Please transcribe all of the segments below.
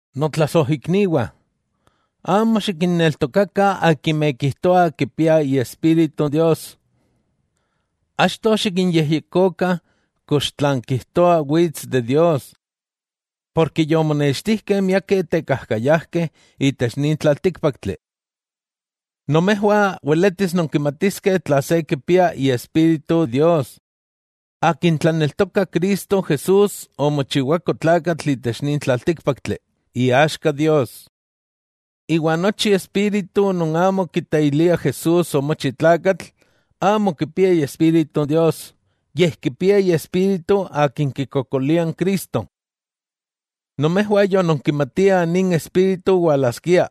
Notlasojikniwah, amo xikinneltokakah akimeh kijtoah kipiah Iespíritu Dios. Achto xikinyejyekokah kox tlan kijtoah wits de Dios. Porke yomonextijkeh miakeh tekajkayajkeh itech nin tlaltíkpaktli. Nomejwah weletis nonkimatiskeh tla se kipia Iespíritu Dios: Akin tlaneltokah Cristo Jesús omochiwako tlakatl itech nin tlaltíkpaktli, iaxka Dios. Iwa nochi espíritu non amo kiteilia Jesús omochi tlakatl, amo kipia Iespíritu Dios, yej kipia iespíritu akin kikokolia n Cristo. Nomejwah yononkimatiah nin espíritu walaskia,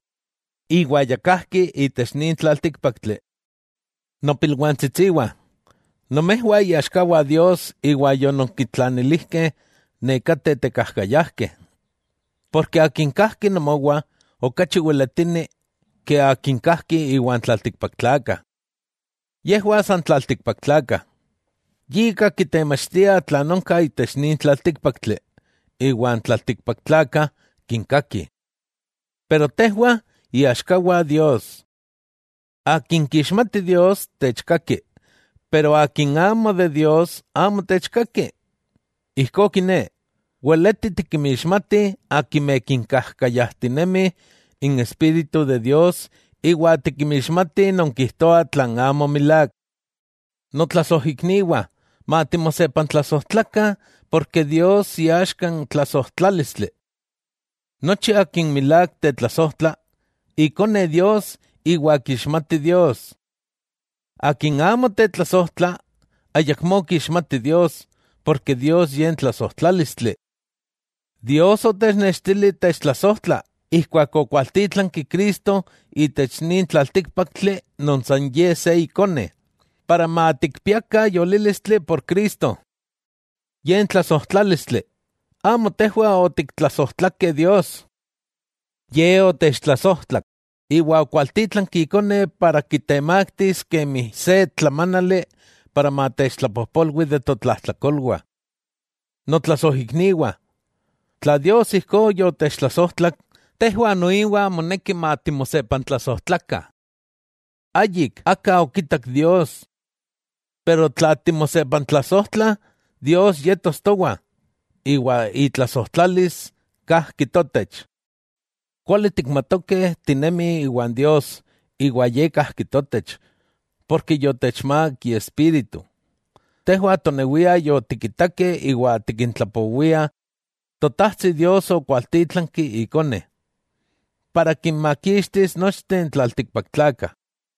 iwa ya kajki itech nin tlaltíkpaktli. Nopilwantsitsiwah, nomejwah iaxkawah Dios iwa yononkintlanilijkeh nekateh tekajkayajkeh, porke Akin kajki nomowah okachi weletini ke akin kajki iwan tlaltikpaktlakah. Yejwah san tlaltikpaktlakah. Yika kitemachtiah tlan onka itech nin tlaltíkpaktli, iwa n tlaltikpaktlakah kinkakih. Pero tejwah iaxkawah Dios. Akin kixmati Dios techkaki, pero akin amo de Dios amo techkaki. Ijkó kiné, weleti tikinmixmatih akimeh kinyakantinemi n Espíritu de Dios iwa tikinmixmatih non kijtoa tlan amo milák. Notlasojikniwah matimosepantlasojtlakah, porke Dios iaxka n tlasojtlálistli. Nochi akin milák tetlasojtla, ikone Dios iwa kixmati Dios. Akin amo tetlasojtla ayamó kixmati Dios, porke Dios Ye n tlasojtlálistli. Dios otechnextili techtlasojtla, ijkuak okwaltítlanki Cristo itech nin tlaltíkpaktli non san Ye se Ikone, para matikpiakah yolílistli por Cristo. Ye n tlasojtlálistli: amo tejwah otiktlasojtlakeh Dios, Ye otechtlasojtlak iwa okualtítlanki Ikone para kitemaktis kemi se tlamánali para matechtlapojpolwi de totlajtlakolwah. Notlasojikniwah, tla Dios ijkó yotechtlasojtlak, tejwah noiwa moneki matimosepantlasojtlakah. Ayik aka yokitak Dios. Pero tla timosepantlasojtlah, Dios yetos towa, iwa itlasojtlalis kajki totech. Kuali tikmatokeh tinemih iwan Dios iwa Ye kajki totech, porke yotechmák Iespíritu. Tejwah tonewiah yotikitakeh iwa tikintlapowiah, Totajtsi Dios okwaltítlanki Ikone, para kinmakixtikis nochteh n tlaltikpaktlakah.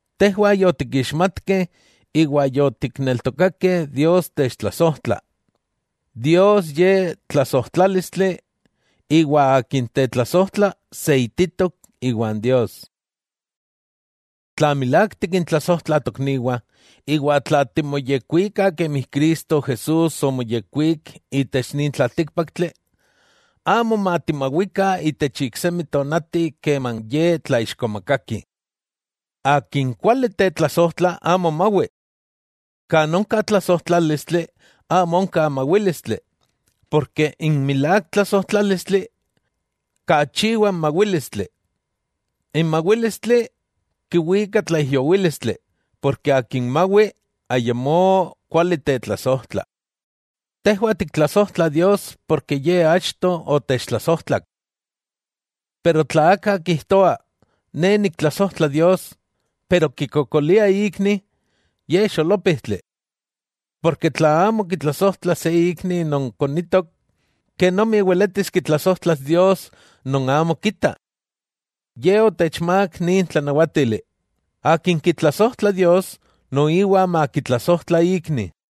Tejwah yotikixmatkeh iwa yotikneltokakeh Dios techtlasojtla. Dios Ye tlasojtlálistli, iwa akin tetlasojtla seititok iwan Dios. Tla milák tikintlasojtla tokniwah, iwa tla timoyekuikah kemi Cristo Jesús omoyekwík itech nin tlaltíkpaktli, amo matimawikah itech iksemi tonati keman Ye tlaixkomakakih. Akin kuali tetlasojtla amo mawi. Kan onka tlasojtlálistli amo onka mawílistli, porke n milák tlasojtlálistli kachiwa n mawílistli. N mawílistli kiwika tlaijyowílistli, porke akin mawi ayamó kuali tetlasojtla. Tejwah tiktlasojtla Dios porke Ye achto otechtlasojtlak. Pero tla aka kijtoa: “Ne niktlasojtla Dios”, pero kikokolia ikni, ye xolópijtli. Porke tla amo kitlasojtla se ikni non konitok, kenomi weletis kitlasojtlas Dios non amo kita. Ye otechmák nin tlanawátili: Akin kitlasojtla Dios noiwa makitlasojtla ikni.